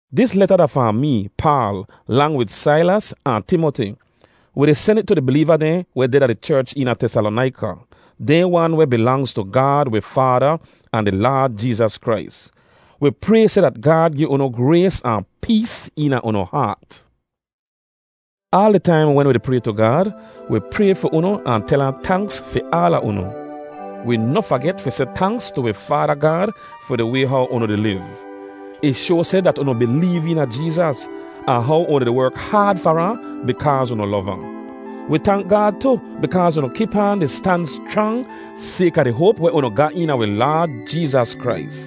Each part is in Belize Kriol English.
Dis leta da fahn mee, Paal, lang wid Sailas ahn Timoti. Wi di sen it tu di bileeva dehn weh deh da di cherch eena Tesalonaika, dehn wan weh bilangz tu Gaad wi Faada ahn di Laad Jeezas Krais. Wi pray seh dat Gaad gi unu grays ahn pees eena unu haat. Aal di taim wen wi di pray tu Gaad, wi pray fi unu ahn tel ahn tanks fi aala unu. Wi noh faget fi seh tanks tu wi Faada Gaad fi di way how unu di liv. Ih shoa seh dat unu bileev eena Jeezas, ahn how unu di werk haad far ahn bikaaz unu lov ahn. Wi tank Gaad tu bikaaz unu kip aan di stan schrang sayka di hoap weh unu ga eena wi Laad Jeezas Krais.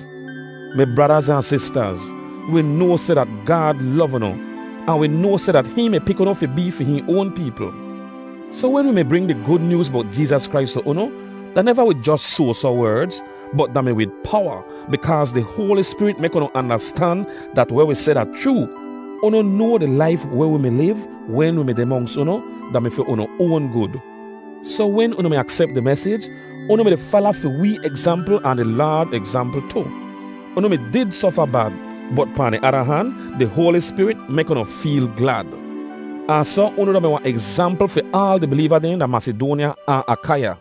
Mi bradaz ahn sistaz, wi noa seh dat Gaad lov unu, ahn wi noa seh dat hihn mi pik unu fi bee fi hihn oan peepl. Soh wen wi mi bring di Gud Nyooz bowt Jeezas Krais tu unu, da neva wid jos soasoh werdz, bot da mi wid powa, bikaaz di Hoali Spirit mek unu andastan dat weh wi seh da chroo. Unu noa di laif weh wi mi liv wen wi mi deh monks unu da mi fi unu oan gud. Soh wen unu mi aksep di mesij, unu mi-di fala fi wee egzampl ahn di Laad egzampl tu. Unu mi did sofa bad, bot pahn di ada han, di Hoali Spirit mek unu feel glad. Ahn soh unu da-mi wahn egzampl fi aal di bileeva dehn da Masidoanya ahn Akaiya.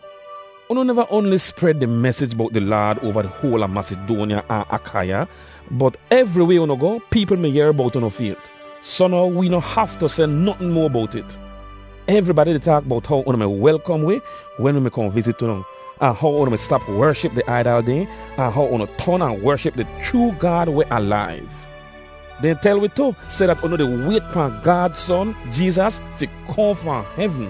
Unu neva oanli spred di mesij bowt di Laad oava di hoal a Masidoanya ahn Akaiya, bot evriway unu goh, peepl mi yehr bowt unu fayt. Soh now, wee noh haftu seh notn moa bowt it. Evribadi di taak bowt how unu mi welkom wi wen wi mi kohn vizit unu, ahn how unu mi stap wership di aidal dehn ahn how unu ton ahn wership di chroo Gaad weh alaiv. Dehn tel wi tu seh dat unu di wayt pahn Gaad Son, Jeezas, fi kohn fahn hevn.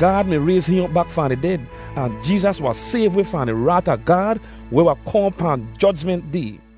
Gaad mi rayz hihn op bak fahn di ded, ahn Jeezas wahn sayv wi fahn di raat a Gaad weh wahn kohn pahn Jojment Day.